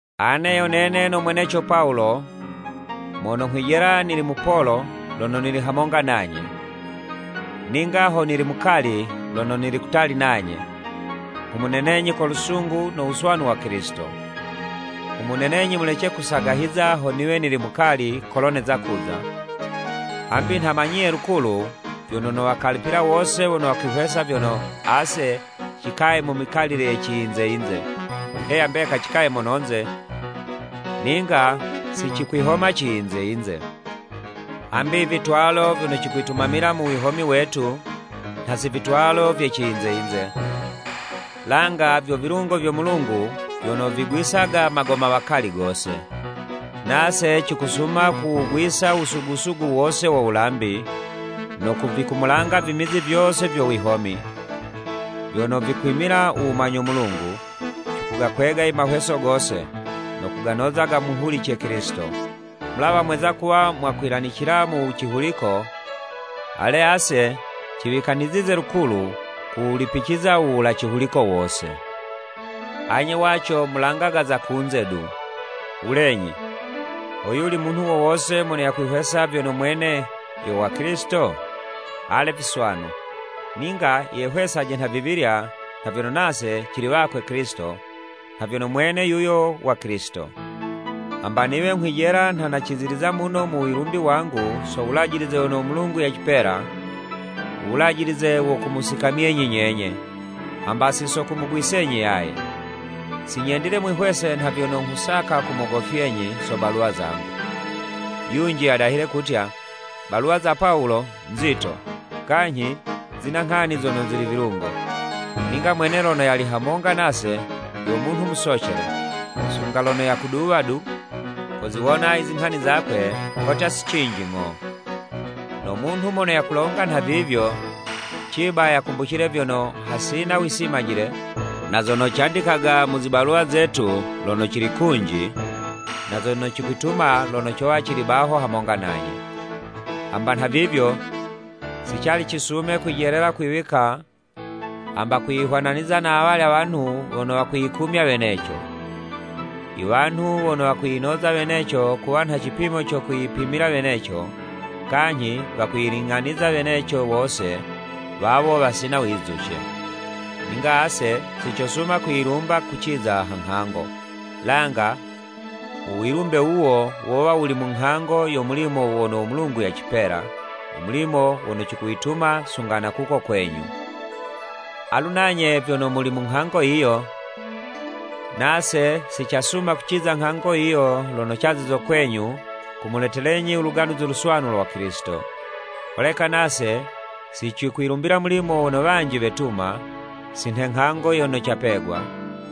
Ane yo nene no mweneco Pawulo, mono nghwijela nili mupolo lono nili hamonga nanye, ninga ho nili mukali lono nili kutali nanye, nghumunenenyi ko lusungu no wuswanu wa Kilisito. Nghumunenenyi mulece kusagahiza ho niwe nili mukali kolo neza kuza, hambi nha manyiye lukulu, vyono nowakalipila wose wono wakwihwesa vyono, ase cikaye mu mikalile ye ciyinze yinze. Heya mbeka cikaye mononze, ninga si cikwihoma ciyinze yinze. Hambi i vitwalo vyono cikwitumamila mu wihomi wetu, nha si vitwalo vye ciyinze yinze, langa vyo vilungo vyo Mulungu vyono vigwisaga magomawakali gose. Nase cikusuma kuwugwiza u wusugu-sugu wose wo wulambi, no kuvikumulanga vimizi vyose vyo wiwoni, vyono vikwimila u wumanyo Mulungu, cikugakwega i mahweso gose, no kuganoza gamuhulice Kilisito. Mulawa mweza kuwa mwakwilanicila mu cihuliko, ale, ase ciwikanizize lukulu kuwulipiciza u wula cihuliko wose. Anye waco mulangaga za kunze du. Wulenyi, ho yuli munhu wo wose mono yakwihwesa vyono mwene yo wa Kilisito? Ale viswanu! Ninga yehwesaje nhavivilya nha vyono nase cili wakwe Kilisito nha vyono mwene yuyo wa Kilisito. Hamba niwe nghwijela nha naciziliza muno u wilumbi wangu so wulajilize wono u Mulungu yacipela, u wulajilize wo kumusikamyenyi nyenye, hamba si so kumugwisenyi yaye. Si nyendile mwihwese nha vyono nghusaka kumogofyenyi so baluwa zangu. Yunji yadahile kutya, “Baluwa za Pawulo nzito, kanyhi zina nghani zono zili vilungo, ninga mwene lono yali hamonga nase, yo munhu musocele, sunga lono yakuduwa du, koziwona i zinghani zakwe kotya si cinji ng'o.” No munhu mono yakulonga nhavivyo, ciba yakumbucile vyono, hasina wisimajile na zono candikaga mu zibaluwa zetu lono cili kunji, na zono cokwituma lono cowa cili baho hamonga nanye. Hamba nhavivyo, si cali cisume kwijelela kwiwika hamba kwiyihwananiza na awalya wanhu wono wakwiyikumya weneco. I wanhu wono wakwiyinoza weneco kuwa nha cipimo co kwiyipimila weneco, kanyhi wakwiyiling'aniza weneco wose, wawo wasina wizuce. Ninga ase si cosuma kwiyilumba kuciza ha nghango, langa u wilumbe wuwo wowa wuli mu nghango yo mulimo wono u Mulungu yacipela, u mulimo wono cikuwituma sunga na kuko kwenyu. Alu nanye vyono muli mu nghango yiyo, nase si casuma kuciza nghango yiyo lono cazizo kwenyu, kumuletelenyi u Luganuzi Luswanu lwa Kilisito. Holeka nase si cikwilumbila mulimo wono wanji wetuma, si nhe nghango yono capegwa,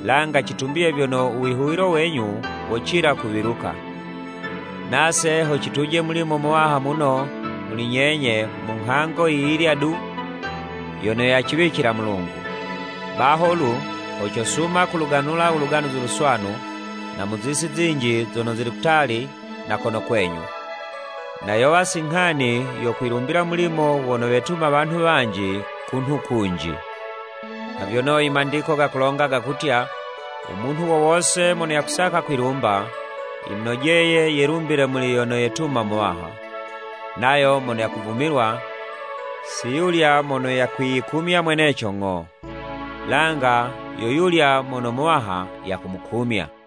langa citumbiye vyono u wihuwilo wenyu wocila kuwiluka, nase ho cituje mulimo muwaha muno muli nyenye mu nghango yi yilya du yono yaciwicila Mulungu. Baho lu, ho cosuma kuluganula u Luganuzi Luswanu na mu zisi zinji zono zili kutali na kono kwenyu, na yowa si nghani yo kwilumbila mulimo wono wetuma wanhu wanji kunhu kunji. Nha vyono i Mandiko gakulonga gakutya, “U munhu wo wose mono yakusaka kwilumba, yimunojeye yelumbile muli yono yetumo Muwaha.” Nayo mono yakuvumilwa, si yulya mono yakwiyikumya mweneco ng'o, langa yo yulya muno Muwaha yakumukumya.